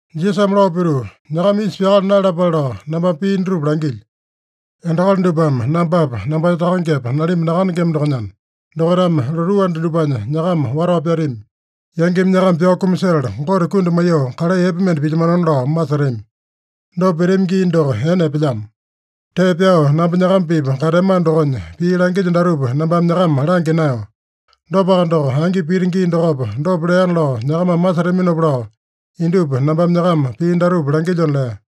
Jisasame lao pituu, “Nyakama isa pyakala naeyalapale lao nambame pii dutupa langilyo. Endakali dupame nambapa, nambanya Takangepa, nalimba nakandengema dokonyana, dokaitame lotuu anda dupanya nyakama watao pyatami. Yangimi nyakama pyao kumasetala, Gote kundi maiyoo kalai epe mende pilyamanona lao masetami. Dopa pitami gii doko ene epelyamo. Tee pyao namba nyakama-pipa kateamano dokonya, pii langilyo datupa nambame nyakama langya naeyo. Dopaka doko, angi pita gii dokopa, dopa leana lao nyakamame masetaminopa lao indupa nambame nyakama pii datupa langilyona” lea.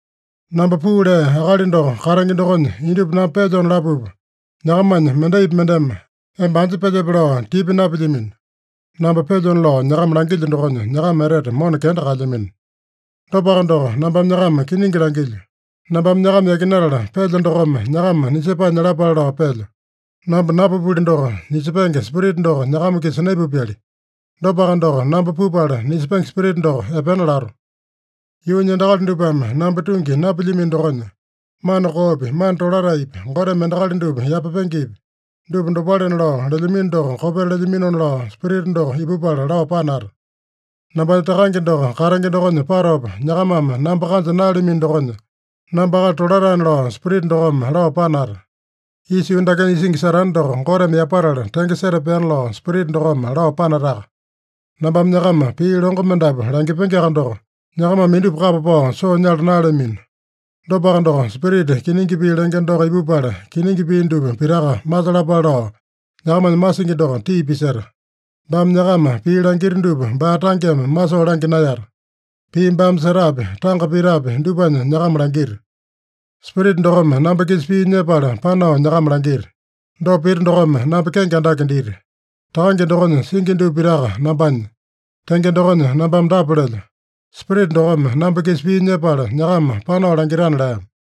“Namba puu lea Akali doko katenge dokonya indupa namba pelyona lapupa, nyakamanya mendaipi mendeme, ‘Emba anja pelyepe?’ lao tipa napilyamino. Namba pelyona lao nyakama langilyo dokonya, nyakama etete mona kenda kaelyamino. Dopaka doko, nambame nyakama kiningi langilyo: Nambame nyakama yakinatala pelyo dokome nyakama nisepae nyalapale lao pelyo. Namba napupuli doko, nisepenge Spirita doko nyakama-kisa naipupyali. Dopaka doko, namba pupala, nisepenge Spirita doko epena lato. Yuunya endakali dupame namba tungi napilyamino dokonya, mana koopi, mana tolataepi, Goteme endakali dupa yapapengepi, dupa dopalena lao lelyamino doko kopeta lelyaminona lao Spirita doko ipupala lao panata. Nambanya Takange doko katenge dokonya patopa, nyakamame namba kanja naeyalamino dokonya, namba akali tolataena lao Spirita dokome lao panata. Isa yuu dakenya isingi Satane doko Goteme yapatala tenge setapeana lao Spirita dokome lao panataka. “Nambame nyakama pii longo mendapu langipengeaka doko, nyakamame indupa kapa pao soo nyala naeyalamino. Dopaka doko, Spirita kiningi pii lenge doko ipupala, kiningi pii dupa pitaka masalapale lao nyakamanya masingi doko tii piseta. Baame nyakama pii langita dupa baa tangeme masoo langya naeyata. Pii baame setapi, tanga pitapi, dupanya nyakama langita. Spirita dokome namba-kisa pii nyepala panao nyakama langita. Dopa pita dokome namba kenge andake dita. Takange dokonya singi dupa pitaka nambanya. Tenge dokonya nambame dapa lelyo: Spirita dokome namba-kisa pii nyepala nyakama panao langitana” lea.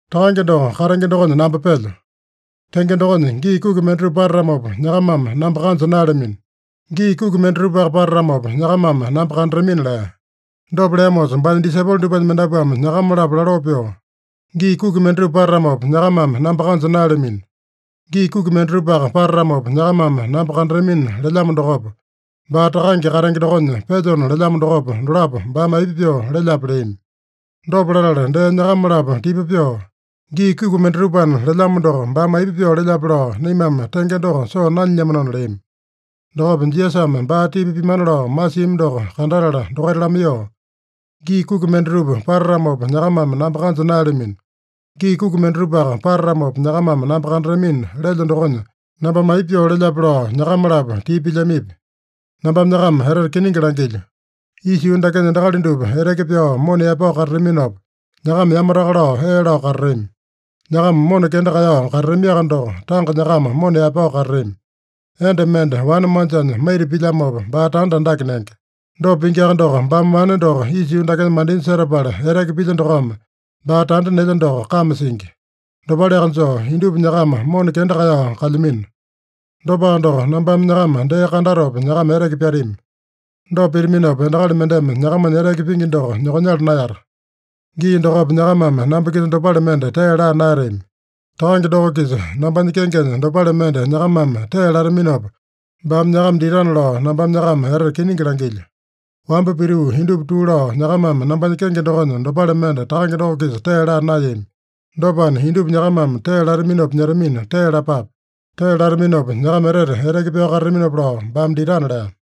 “Takange doko katenge dokonya namba pelyo. Tenge dokonya, gii kuki mendatupa patatamopa, nyakamame namba kanja naeyalamino. Gii kuki mendatupaka patatamopa, nyakamame namba kandatamina” lea. Dopa leamosa baanya disaipolo dupanya mendapuame nyakama-lapo laloo pyoo, “ ‘Gii kuki mendatupa patatamopa, nyakamame namba kanja naeyalamino. Gii kuki mendatupaka patatamopa, nyakamame namba kandatamina’ lelyamo dokopa, baa ‘Takange katenge dokonya pelyona’ lelyamo dokopa, dolapo baame aipa pyoo lelyape?” leami. Dopa latala dee nyakama-lapo tipa pyoo, “ ‘Gii kuki mendatupana’ lelyamo doko, baame aipa pyoo lelyape lao naimame tenge doko soo nanyilyamanona” leami. Dokopa Jisasame baa tipa pimana lao masiami doko kandatala dokaita lamaiyoo, “ ‘Gii kuki mendatupa patatamopa, nyakamame namba kanja naeyalamino. Gii kuki mendatupaka patatamopa, nyakamame namba kandatamina’ lelyo dokonya nambame aipa pyoo lelyape lao nyakama-lapo tipa pilyamipi? Nambame nyakama etete kiningi langilyo: Isa yuu dakenya endakali dupa eteke pyao mona yaepao katataminopa, nyakama yamataka lao ee lao katatami. Nyakama mona kenda kaeyao katatamiaka doko, tanga nyakama mona yaepao katatami. Enda mende wane manjanya maita pilyamopa, baa tanda andake nenge. Dopa pingiaka doko, baame wane doko isa yuu dakenya mandinya setapala eteke pilya dokome, baa tanda nelya doko kame singi. Dopaleaka joo, indupa nyakama mona kenda kaeyao kalyamino. Dopaka doko, nambame nyakama dee kandatopa, nyakama eteke pyatami. Dopa pitaminopa, endakali mendeme nyakamanya eteke pingi doko nyokonyala naeyata. Gii dokopa nyakamame namba-kisa dopale mende tee laa naeyatami. Takange doko-kisa nambanya kengenya dopale mende nyakamame tee lataminopa baame nyakama ditana lao nambame nyakama etete kiningi langilyo. Wamba pituu indupa tuu lao, nyakamame nambanya kenge dokonya dopale mende Takange doko-kisa tee laa naeyami. Dopana, indupa nyakamame tee lataminopa nyetamina, tee lapape. Tee lataminopa, nyakama etete eteke pyao katataminopa lao baame ditana” lea.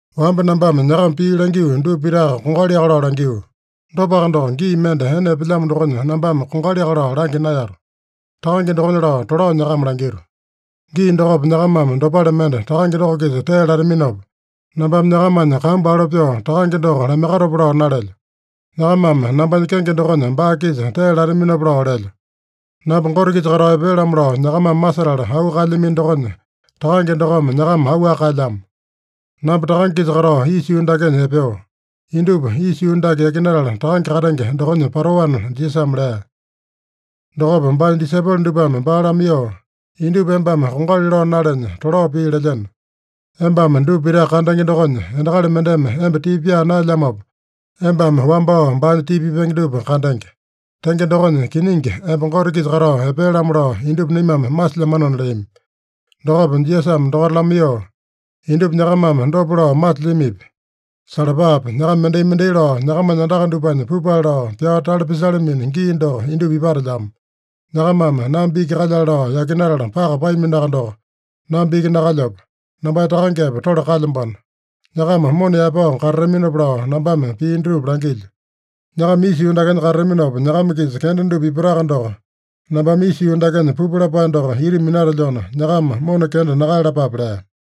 “Wamba nambame nyakama pii langio dupa pitaka kongaliaka lao langio. Dopaka doko, gii mende ene epelyamo dokonya nambame kongaliaka lao langya naeyato. Takange dokonya lao tolao nyakama langito. Gii dokopa nyakamame dopale mende Takange doko-kisa tee lataminopa, nambame nyakamanya kambu alo pyoo Takange doko lamaiyakatopa lao nalelyo. Nyakamame nambanya kenge dokonya baa-kisa tee lataminopa lao lelyo. Namba Gote-kisa katao epea-lamo lao nyakamame masetala auu kaelyamino dokonya, Takange dokome nyakama auwaka kaelyamo. Namba Takange-kisa katao isa yuu dakenya epeo. Indupa isa yuu dake yakinatala Takange katenge dokonya patoana” Jisasame lea. Dokopa baanya disaipolo dupame baa lamaiyoo, “Indupa embame kongali lao nalenya, tolao pii lelyeno. Embame dupa pitaka kandenge dokonya, endakali mendeme emba tipa pyaa naelyamopa, embame wambao baanya tipa pipenge dupa kandenge. Tenge dokonya, kiningi emba Gote-kisa katao epea-lamo lao indupa naimame masilyamanona” leami. Dokopa Jisasame dokaita lamaiyoo, “Indupa nyakamame dopa lao masilyamipi? Salapape! Nyakama mendai-mendai lao nyakamanya andaka dupanya pupale lao, pyao tale pisalamino gii doko indupa ipatelyamo. Nyakamame namba iki kalyale lao yakinatala paka paaminoaka doko, namba iki nakalyapo. Nambanya Takangepa tole kalyambano. Nyakama mona yaepao katataminopa lao nambame pii dutupa langilyo. Nyakama isa yuu dakenya katataminopa nyakama-kisa kenda dupa ipataka doko, nambame isa yuu dakenya pupu lapae doko ita minatelyona, nyakama mona kenda nakaeyalapape” lea.